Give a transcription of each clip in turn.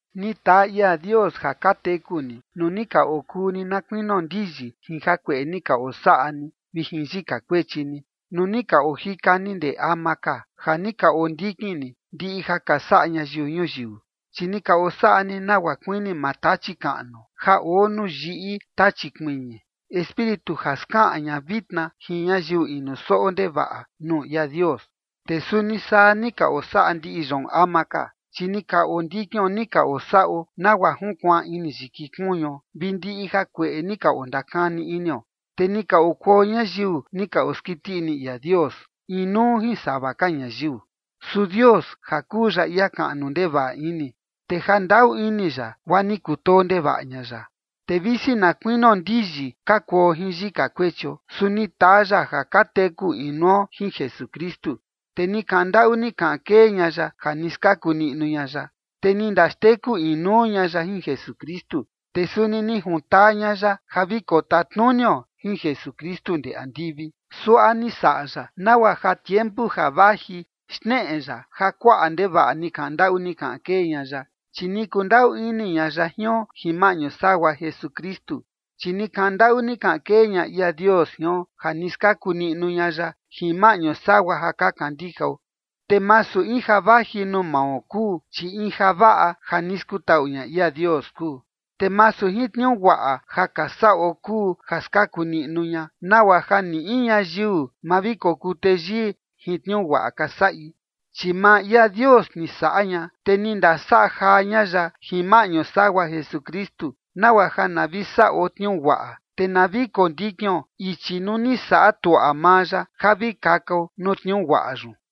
Ni taa ia Dios ja ka teku ni, nuu ni ka okuu ni na kuinio ndiyi jin jakueꞌe ni ka osaꞌa ni vi jin yika kuechi ni, nuu ni ka ojika ni ndee ama ka, ja ni ka ondikin ni ndiꞌi ja ka saꞌa ñayiu ñuyiu. Chi ni ka osaꞌa ni nagua kuini maa Tachi kaꞌnu ja oo nuu yiꞌi tachi kuiñi, espíritu ja skaꞌan ña vitna jin ñayiu inu soꞌo ndevaꞌa nuu ia Dios. Te suni saa ni ka osaꞌa ndiꞌi yoon ama ka, chi ni ka ondikion ni ka osaꞌo nagua junkuaan ini yiki kuñuo vi ndiꞌi jakueꞌe ni ka ondakani inio, te ni ka okuo ñayiu ni ka oskiti ini ia Dios, inuu jin sava ka ñayiu. Su Dios, ja kuu ya ia kaꞌnu ndevaꞌa ini, te jandaꞌu ini ya, guaa ni kutoo ndevaꞌa ña ya. Te visi na kuinio ndiyi ka kuo jin yika kuechio, su ni taa ya ja ka teku inuo jin Jesukristu, te ni kaꞌan ndaꞌu ni kaꞌan kee ña ya ja ni skaku niꞌnu ña ya. Te ni ndaxteku inuu ña ya jin Jesukristu, te suni ni juntaa ña ya ja vi kotatnunio jin Jesukristu ndee andivi. Suaꞌa ni saꞌa ya nagua ja tiempu ja vaji xneꞌe ya ja kuaꞌa ndevaꞌa ni kaꞌan ndaꞌu ni kaꞌan kee ña ya, chi ni kundaꞌu ini ña ya jion jin maꞌñu sagua Jesukristu. Chi ni kaꞌan ndaꞌu ni kaꞌan kee ña ia Dios jion, ja ni skaku niꞌnu ña ya jin maꞌñu sagua ja ka kandijao. Te masu in ja vaji nuu mao kuu, chi in javaꞌa ja ni skutaꞌu ña ia Dios kuu. Te masu jin tniuu guaꞌa ja ka saꞌo kuu ja skaku niꞌnu ña, nagua ja ni in ñayiu ma vi kokuu teyii jin tniuu guaꞌa ka saꞌi. Chi maa ia Dios ni saꞌa ña, te ni ndasaꞌa jaa ña ya jin maꞌñu sagua Jesukristu, nagua ja na vi saꞌo tniuu guaꞌa, te na vi kondikion ichi nuu ni saꞌa tuaꞌa maa ya ja vi kakao nuu tniuu guaꞌa yun.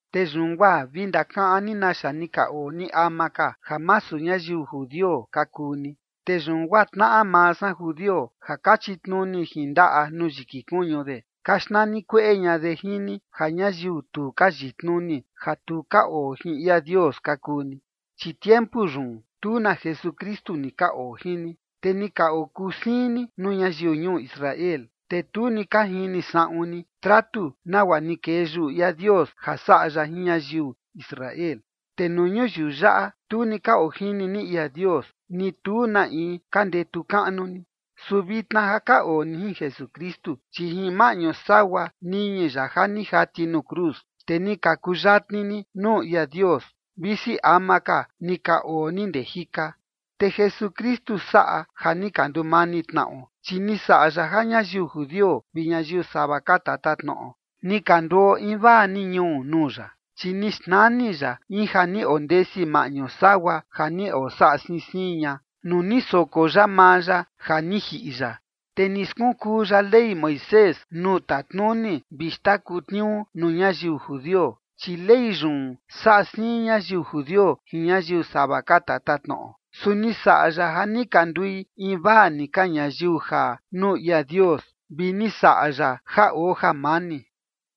Te yun guaa vi ndakaꞌan ni naxa ni ka oo ni ama ka, ja masu ñayiu judio ka kuu ni. Te yun guaa tnaꞌa maa san judio, ja ka chitnuni jin ndaꞌa nuu yiki kuñu de, ka xnani kueꞌe ña de jin ni ja ñayiu tu ka yitnuni, ja tu ka oo jin ia Dios ka kuu ni. Chi tiempu yun, tu na Jesukristu ni ka oo jin ni, te ni ka okuu siin ni nuu ñayiu ñuu Israel, te tu ni ka jini saꞌun ni tratu nagua ni kee yuꞌu ia Dios ja saꞌa ya jin ñayiu Israel. Te nuu ñuyiu yaꞌa, tu ni ka ojini ni ia Dios, ni tu na in ka ndetu kaꞌnu ni. Su vitna ja ka oo ni jin Jesukristu, chi jin maꞌñu sagua niñi ya ja ni jati nuu cruz, te ni ka kuyatni ni nuu ia Dios, visi ama ka ni ka oo ni ndee jika. Te Jesukristu saꞌa ja ni ka ndumani tnaꞌo, chi ni saꞌa ya ja ñayiu judio vi ñayiu sava ka tatatnoꞌo ni ka nduo invaa ni ñuu nuu ya, chi ni xnani ya in ja ni ondesi maꞌñu sagua ja ni osaꞌa siin siin ña, nuu ni soko ya maa ya ja ni jiꞌi ya. Te ni skunkuu ya Ley Moisés nuu tatnuni vi xndaku tniuu nuu ñayiu judio, chi Ley yun saꞌa siin ñayiu judio jin ñayiu sava ka tatatnoꞌo. Su ni saꞌa ya ja ni ka ndui invaa ni ka ñayiu jaa nuu ia Dios, vi ni saꞌa ya ja oo jamani.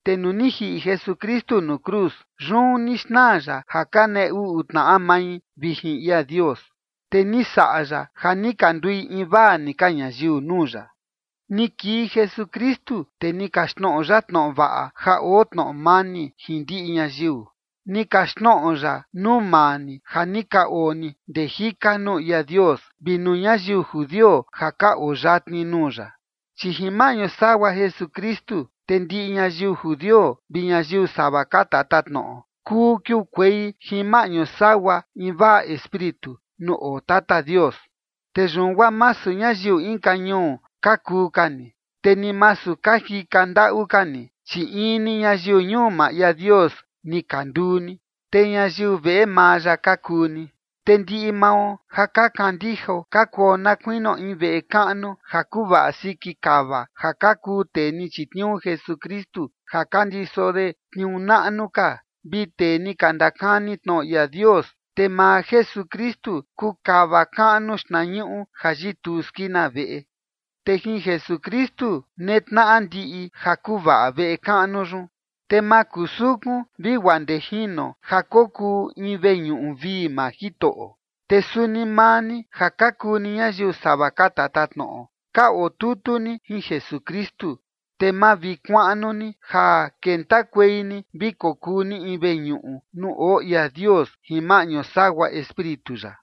Te nuu ni jiꞌi Jesukristu nuu cruz, yun ni xnaa ya ja ka nee uꞌu tnaꞌa mai vi jin ia Dios, te ni saꞌa ya ja ni ka ndui invaa ni ka ñayiu nuu ya. Ni kii Jesukristu, te ni kaxtnoꞌo ya tnoꞌo vaꞌa ja oo tnoꞌo mani jin ndiꞌi ñayiu. Ni kaxtnoꞌo ya nuu maa ni ja ni ka oo ni ndee jika nuu ia Dios, vi nuu ñayiu judio ja ka oo yatni nuu ya. Chi jin maꞌñu sagua Jesukristu, te ndiꞌi ñayiu judio vi ñayiu sava ka tatatnoꞌo kuu kiukuei jin maꞌñu sagua invaa Espíritu nuu oo Tata Dios. Te yun guaa masu ñayiu inka ñuu ka kuu ka ni, te ni masu ka jika ndaꞌu ka ni, chi in ni ñayiu ñuu maa ia Dios ni ka nduu ni, te ñayiu veꞌe maa ya ka kuu ni. Te ndiꞌi mao ja ka kandijao ka kuo na kuinio in veꞌe kaꞌnu ja kuvaꞌa siki kava ja ka kuu tee ni chitniuu Jesukristu ja ka ndiso de tniuu naꞌnu ka, vi tee ni ka ndakani tnoꞌo ia Dios, te maa Jesukristu kuu kava kaꞌnu xtnañuꞌu ja yituu skina veꞌe. Te jin Jesukristu netnaꞌa ndiꞌi ja kuvaꞌa veꞌe kaꞌnu yun, te makusukun vi guaa ndee jino ja kokuu in veñuꞌu vii maa Jitoꞌo. Te suni maa ni ja ka kuu ni ñayiu sava ka tatatnoꞌo, ka oo tutu ni jin Jesukristu, te mavikuaꞌnu ni ja kentakuei ni vi kokuu ni in veñuꞌu nuu oo ia Dios jin maꞌñu sagua Espíritu ya.